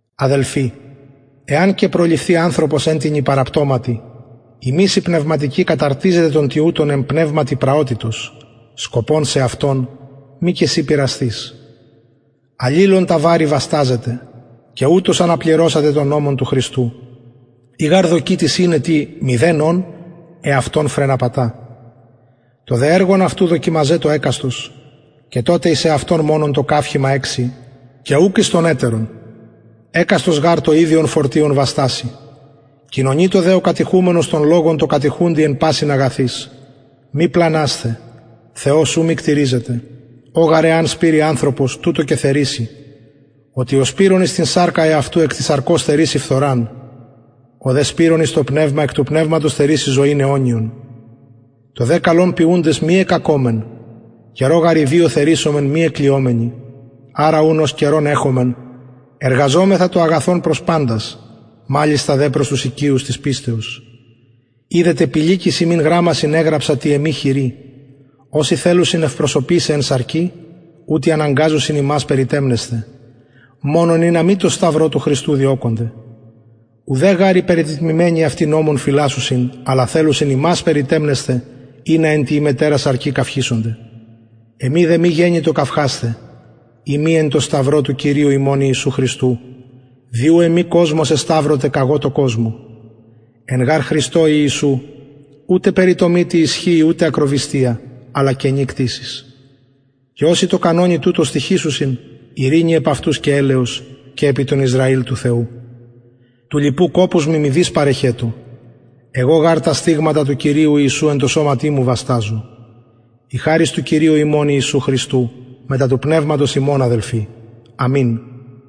αδελφοι εαν και προληφθη ανθρωπος εν τινι παραπτωματι υμεις οι πνευματικοι καταρτιζετε τον τοιουτον εν πνευματι πραοτητος σκοπων σεαυτον μη και συ πειρασθης αλληλων τα βαρη βασταζετε και ουτως αναπληρωσατε τον νομον του χριστου ει γαρ δοκει τις ειναι τι μηδεν ων εαυτον φρεναπατα το δε εργον εαυτου δοκιμαζετω εκαστος και τοτε εις εαυτον μονον το καυχημα εξει και ουκ εις τον ετερον εκαστος γαρ το ιδιον φορτιον βαστασει κοινωνειτω δε ο κατηχουμενος τον λογον τω κατηχουντι εν πασιν αγαθοις μη πλανασθε θεος ου μυκτηριζεται ο γαρ εαν σπειρη ανθρωπος τουτο και θερισει οτι ο σπειρων εις την σαρκα εαυτου εκ της σαρκος θερισει φθοραν ο δε σπειρων εις το πνευμα εκ του πνευματος θερισει ζωην αιωνιον το δε καλον ποιουντες μη εκκακωμεν καιρω γαρ ιδιω θερισομεν μη εκλυομενοι αρα ουν ως καιρον εχομεν εργαζωμεθα το αγαθον προς παντας μαλιστα δε προς τους οικειους της πιστεως ιδετε πηλικοις υμιν γραμμασιν εγραψα τη εμη χειρι οσοι θελουσιν ευπροσωπησαι εν σαρκι ουτοι αναγκαζουσιν υμας περιτεμνεσθαι μονον ινα μη τω σταυρω του χριστου διωκωνται ουδε γαρ οι περιτετμημενοι αυτοι νομον φυλασσουσιν αλλα θελουσιν υμας περιτεμνεσθαι ινα εν τη υμετερα σαρκι καυχησωνται εμοι δε μη γενοιτο καυχασθαι ει μη εν τω σταυρω του κυριου ημων ιησου χριστου δι ου εμοι κοσμος εσταυρωται καγω τω κοσμω εν γαρ χριστω ιησου ουτε περιτομη τι ισχυει ουτε ακροβυστια αλλα καινη κτισις και οσοι τω κανονι τουτω στοιχησουσιν ειρηνη επ αυτους και ελεος και επι τον ισραηλ του θεου του λοιπου κοπους μοι μηδεις παρεχετω εγω γαρ τα στιγματα του κυριου ιησου εν τω σωματι μου βασταζω η χαρις του κυριου ημων ιησου χριστου μετα του πνευματος υμων αδελφοι αμην